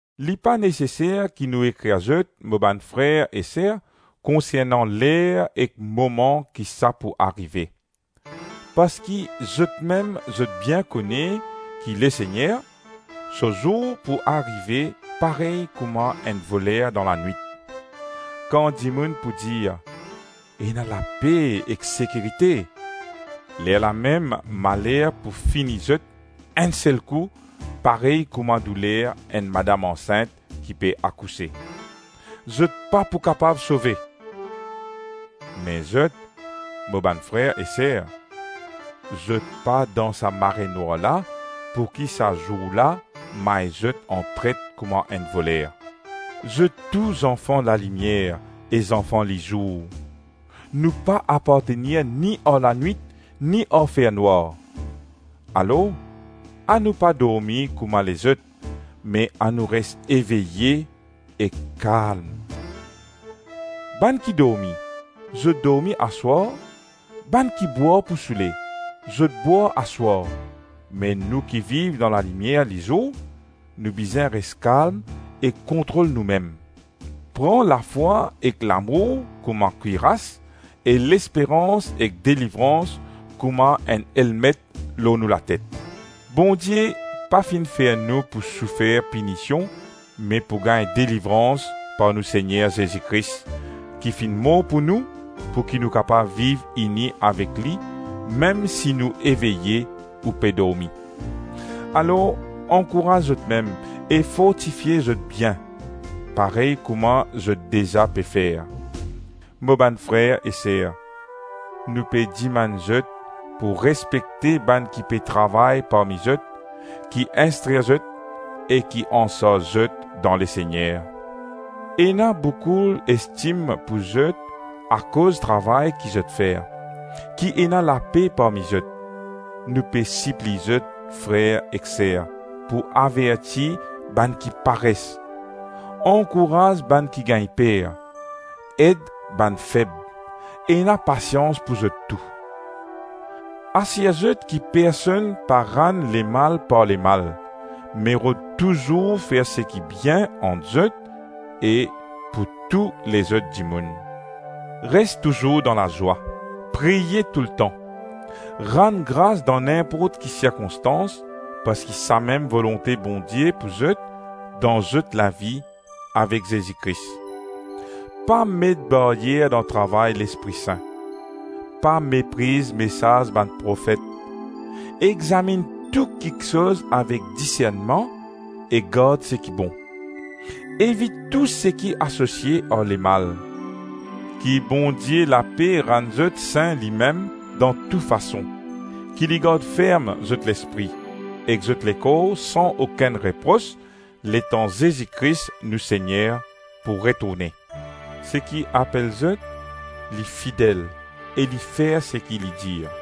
Li pa neseser ki nou ekrir zot, mo bann frer e ser, konsernan ler ek moman ki sa pou arive. Parski zotmem zot bien kone ki Lesegner, so zour pou arive parey kouma enn voler dan lanwit. Kan dimoun pou dir, “Ena lape ek sekirite,” lerlamem maler pou fini zot enn sel kou parey kouma douler enn madam ansint ki pe akouse. Zot pa pou kapav sove. Me zot, mo bann frer e ser, zot pa dan sa marenwar la pouki sa zour la may zot antret kouma enn voler. Zot tou zanfan lalimier e zanfan lizour; nou pa apartenir ni ar lanwit ni ar fernwar. Alor anou pa dormi kouma lezot, me anou res eveye ek kalm. Bann ki dormi, zot dormi aswar, bann ki bwar pou soule, zot bwar aswar, me nou ki viv dan lalimier lizour, nou bizin res kalm e kontrol noumem. Pran lafwa ek lamour kouma kwiras e lesperans ek delivrans kouma enn elmet lor nou latet. Bondie pa finn fer nou pou soufer pinision me pou gagn delivrans par nou Segner Zezi Kris, ki finn mor pou nou, pou ki nou kapav viv ini avek li mem si nou eveye ou pe dormi. Alor ankouraz zotmem e fortifie zot bien, parey kouma zot deza pe fer. Mo bann frer e ser, nou pe dimann zot pou respekte bann ki pe travay parmi zot, ki instrir zot, e ki ansarz zot dan Lesegner. Ena boukou estim pou zot akoz travay ki zot fer. Ki ena lape parmi zot. Nou pe sipliy zot, frer ek ser, pou averti bann ki pares, ankouraz bann ki gagn per, ed bann feb, ena pasians pou zot tou. Asir zot ki personn pa rann lemal par lemal, me rod touzour fer seki bien ant zot e pou tou lezot dimoun. Res touzour dan lazwa. Priye toultan. Rann gras dan ninport ki sirkonstans, parski samem volonte Bondie pou zot dan zot lavi avek Zezi Kris. Pa met baryer dan travay Lespri Sin. Pa mepriz mesaz bann profet; examinn tou kiksoz avek disernman e gard seki bon. Evit tou seki asosie ar lemal. Ki Bondie lape rann zot sin limem dan tou fason, ki li gard ferm zot lespri, ek zot lekor san okenn repros letan Zezi Kris nou Segner pou retourne. Seki apel zot li fidel e li fer seki li dir.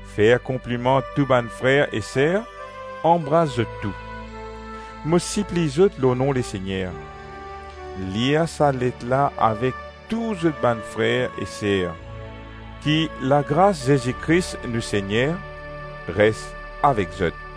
Fer konpliman tou bann frer e ser, anbras zot tou. Mo sipliy zot lor nom Lesegner, lir sa let la avek tou zot bann frer e ser. Ki lagras Zezi Kris nou Segner res avek zot.